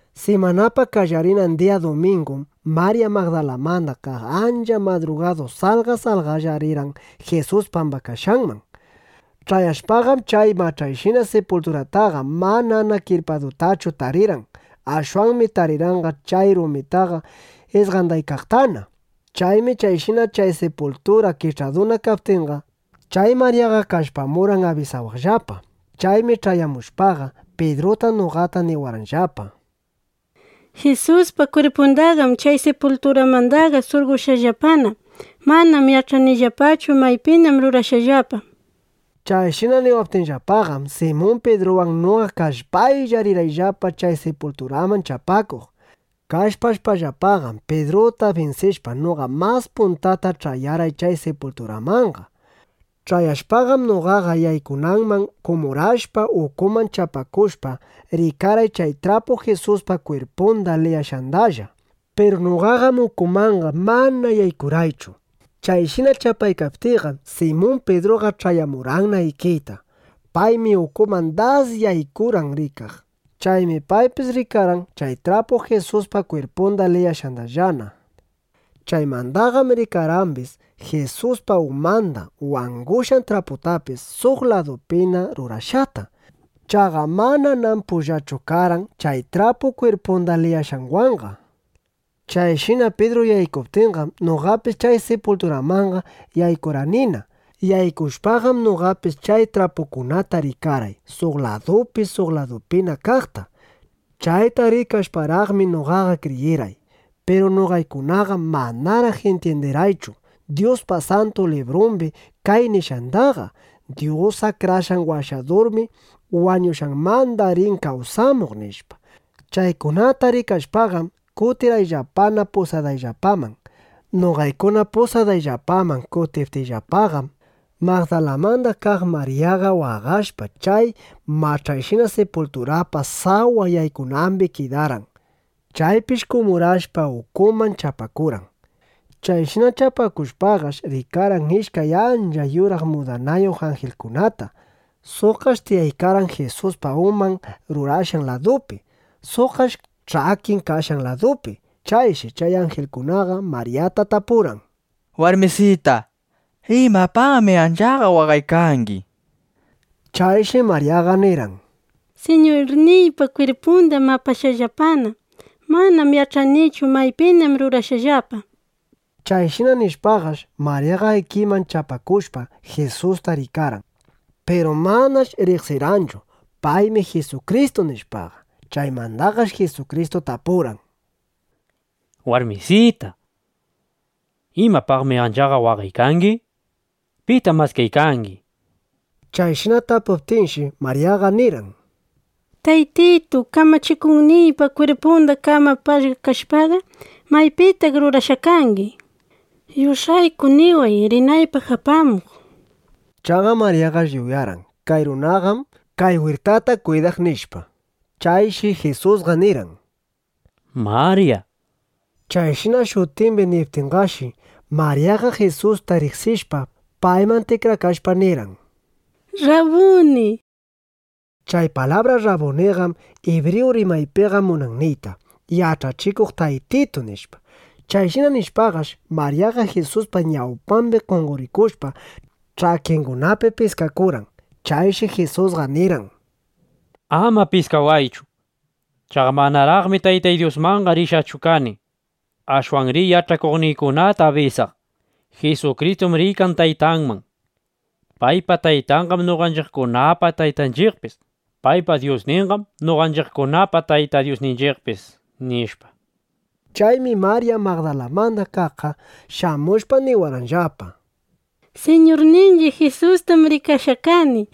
Simanapa qallarinan diya dumingum Marya Magdalamanda kaq ancha madrugadu salqa salqalla rirqan Jisus pambakashqanman. Ch'ayashpaqam, chay mach'ayshina sipulturataqa manana kirpadutachu tarirqan. Ashwanmi tarirqanqa chay rumitaqa isqandaykaqtana. Chaymi chayshina chay sipultura kich'aduna kaptinqa, chay Maryaqa kallpamurqan abisawaqllapa. Chaymi ch'ayamushpaqa, Pidruta, noqata niwarqanllapa: —¡Jisuspa kwirpundaqam chay sipulturamandaqa surqoshqallapana! Manam yach'anillapachu maypinam rurashqallapa, nishpa. Chayshina niwaptinllapaqam, Simun Pidruwan noqa kallpaylla, rirqayllapa chay sipulturaman chapakuq. Kallpashpaqam, Pidruta binsishpa, noqa mas puntata ch'ayarqay chay sipulturamanqa. Ch'ayashpaqam, noqaqa yaykunanman kumurashpa, ukuman chapakushpa, rikarqay chay trapu Jisuspa kwirpunda liyashqandallana. Piru noqaqam ukumanqa mana yaykurqaychu. Chayshina chapaykaptiyqam, Simun Pidruqa ch'ayamurqanna ikiyta. Paymi ukuman das yaykurqan rikaq. Chaymi paypis rikarqan chay trapu Jisuspa kwirpunda liyashqandallana. Chaymandaqam rikarqambis Jisuspa umanda wangushqan traputapis, suq ladupina rurashqata. Chaqa mananam pullachu karqan chay trapu kwirpunda liyashqanwanqa. Chayshina Pidru yaykuptinqam, noqapis chay sipulturamanqa yaykurqanina. Yaykushpaqam, noqapis chay trapukunata rikarqay, suq ladupi suq ladupina kaqta. Chayta rikashparaqmi, noqaqa kriyirqay. Piru noqaykunaqam manaraq intyindirqaychu Dyuspa Santu Librumbi kay nishqandaqa: Dyus Akrashqan Washadurmi wañushqanmanda rin kawsamuq, nishpa. Chaykunata rikashpaqam, kutirqayllapana pusadayllapaman. Noqaykuna pusadayllapaman kutiptiyllapaqam, Magdalamanda kaq Maryaqa waqashpa, chay mach'ayshina sipulturapa sawa yaykunambi kidarqan. Chaypish kumurashpa, ukuman chapakurqan. Chayshina chapakushpaqash, rikarqan ishkay ancha yuraq mudanayuq anjilkunata. Suqqash tiyaykarqan Jisuspa uman rurashqan ladupi; suqqash ch'akin kashqan ladupi. Chayshi chay anjilkunaqa Maryata tapurqan: —Warmisita, ¿imapaqmi anchaqa waqaykangi? nishpa. Chayshi Maryaqa nirqan: —Siñurniypa kwirpundam apashqallapana. Manam yach'anichu, maypinam rurashqallapa, nishpa. Chayshina nishpaqash, Maryaqa ikiman chapakushpa, Jisusta rikarqan. Piru manash riqsirqanchu: Paymi Jisukristu, nishpaqa. Chaymandaqash Jisukristu tapurqan: —Warmisita, ¿imapaqmi anchaqa waqaykangi? ¿Pitam maskaykangi? nishpa. Chayshina tapuptinshi, Maryaqa nirqan: —Taytitu, Kamachikuqniypa kwirpunda qam apashqa kashpaqa, ¿maypitaq rurashqa kangi? Yush'ayku niway, rinaypaq apamuq. Chaqa Maryaqash yuyarqan: Kay runaqam kay wirtata kwidaq, nishpa. Chayshi Jisusqa nirqan: —¡Marya! nishpa. Chayshina shutimbi niptinraqshi, Maryaqa Jisusta riqsishpa, payman tikrakashpa, nirqan: —¡Rrabuni! nishpa. Chay palabra “Rrabuniqam” ibriyu rimaypiqa munan niyta: “Yach'achikuq Taytitu”, nishpa. (Chayshina nishpaqash, Maryaqa Jisuspa ñawpambi qonqorikushpa, ch'akingunapi piskakurqan.) Chayshi Jisusqa nirqan: —Ama piskawaychu. Chaqa manaraqmi Taytay Dyusmanqa rishqachu kani. Ashwan riy yach'akuqniykunata abisaq: “Jisukristum riykan Taytanman. Paypa Taytanqam noqanchiqkunapa Taytanchiqpis. Paypa Dyusninqam noqanchiqkunapa Tayta Dyusninchiqpis”, nishpa. Chaymi Marya Magdalamanda kaqqa shamushpa, niwarqanllapa: —Siñurninchiq Jisustam rikashqa kani.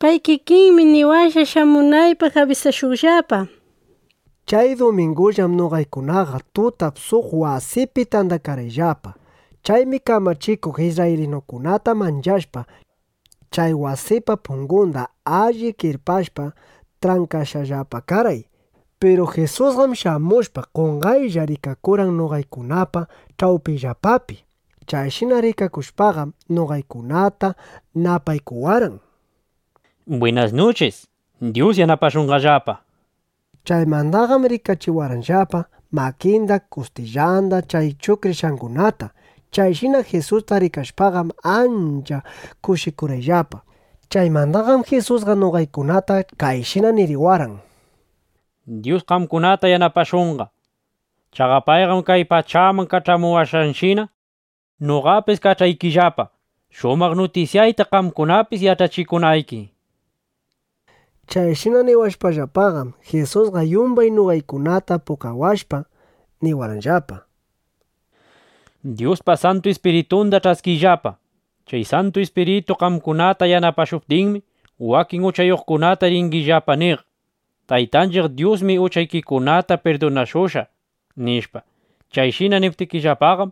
Pay kikinmi niwashqa, shamunaypaq abisashuqllapa, nishpa. Chay dumingullam noqaykunaqa tutap suq wasipi tandakarqayllapa. Chaymi kamachikuq isrraylinukunata manchashpa, chay wasipa pungunda alli kirpashpa, trankashqallapa karqay. Piru Jisusqam shamushpa, qonqaylla rikakurqan noqaykunapa ch'awpiyllapapi. Chayshina rikakushpaqam, noqaykunata napaykuwarqan: —Bwinas nuchis. Dyus yanapashunqallapa, nishpa. Chaymandaqam rikachiwarqanllapa makinda, kustillanda chay chuqrishqangunata. Chayshina Jisusta rikashpaqam, ancha kushikurqayllapa. Chaymandaqam Jisusqa noqaykunata kayshina niriwarqan: —Dyus qamkunata yanapashunqa. Chaqa payqam kay pachaman kach'amuwashqanshina, noqapis kach'aykillapa, shumaq nutisyayta qamkunapis yach'achikunayki. Chayshina niwashpallapaqam, Jisusqa yumbay noqaykunata pukawashpa, niwarqanllapa: —Dyuspa Santu Ispiritunda ch'askiyllapa. Chay Santu Ispiritu qamkunata yanapashuptinmi, wakin uchayuqkunata ringillapa niq: “Taytanchiq Dyusmi uchaykikunata pirdunashushqa”, nishpa. Chayshina niptikillapaqam,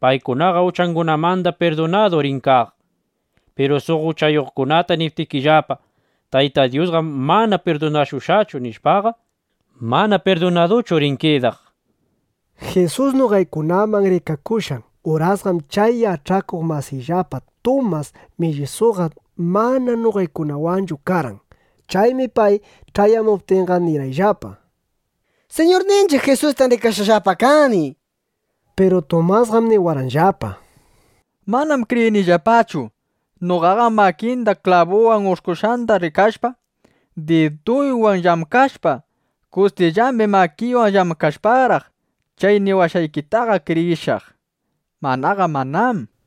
paykunaqa uchangunamanda pirdunadu rin kaq. Piru suq uchayuqkunata niptikillapa: “Tayta Dyusqam mana pirdunashushqachu”, nishpaqa, mana pirdunaduchu rin kidaq. Jisus noqaykunaman rikakushqan urasqam chay yach'akuq masiyllapa Tumas Millisuqa mana noqaykunawanchu karqan. Chaymi pay ch'ayamuptinqa, nirqayllapa: —Siñurninchiq Jisustam rikashqallapa kani, nishpa. Piru Tumasqam niwarqanllapa: —Manam kriyiykillapachu. Noqaqam makinda klabu ush'kushqanda rikashpa, diduywan llamkashpa, kustillambi makiywan llamkashparaq, chay niwashqaykitaqa kriyishaq. Manaqa manám, nishpa.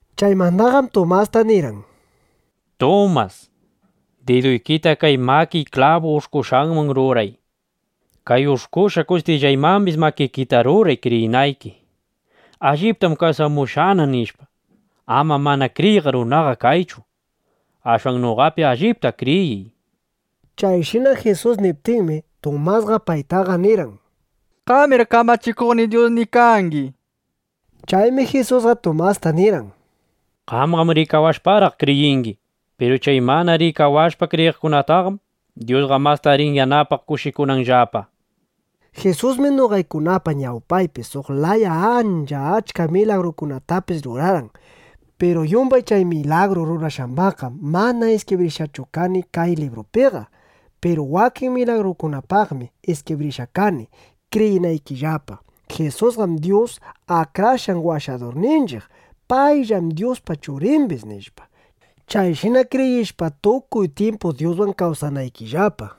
Chaymandaqam Tumasta nirqan: —Tumas, diduykita kay makiy klabu ush'kushqanman ruray. Kay ush'kushqa kustillaymambis makikita ruray kriyinayki: Alliptam kawsamushqana, nishpa. Ama mana kriyiq runaqa kaychu. Ashwan noqapi allipta kriyiy, nishpa. Chayshina Jisus niptinmi, Tumasqa paytaqa nirqan: —¡Qamir Kamachikuqniy, Dyusniy kangi! nishpa. Chaymi Jisusqa Tumasta nirqan: —Qamqam rikawashparaq kriyingi. Piru chay mana rikawashpa kriyiqkunataqam Dyusqa masta rin yanapaq, kushikunanllapa, nishpa. Jisusmi noqaykunapa ñawpaypi suq laya ancha achka milagrukunatapis rurarqan. Piru yumbay chay milagru rurashqambaqqam mana iskibrishqachu kani kay librupiqa. Piru wakin milagrukunapaqmi iskibrishqa kani, kriyinaykillapa: Jisusqam Dyus Akrashqan Washadurninchiq. Payllam Dyuspa Churimbis, nishpa, chayshina kriyishpa, tukuy tyimpu Dyuswan kawsanaykillapa.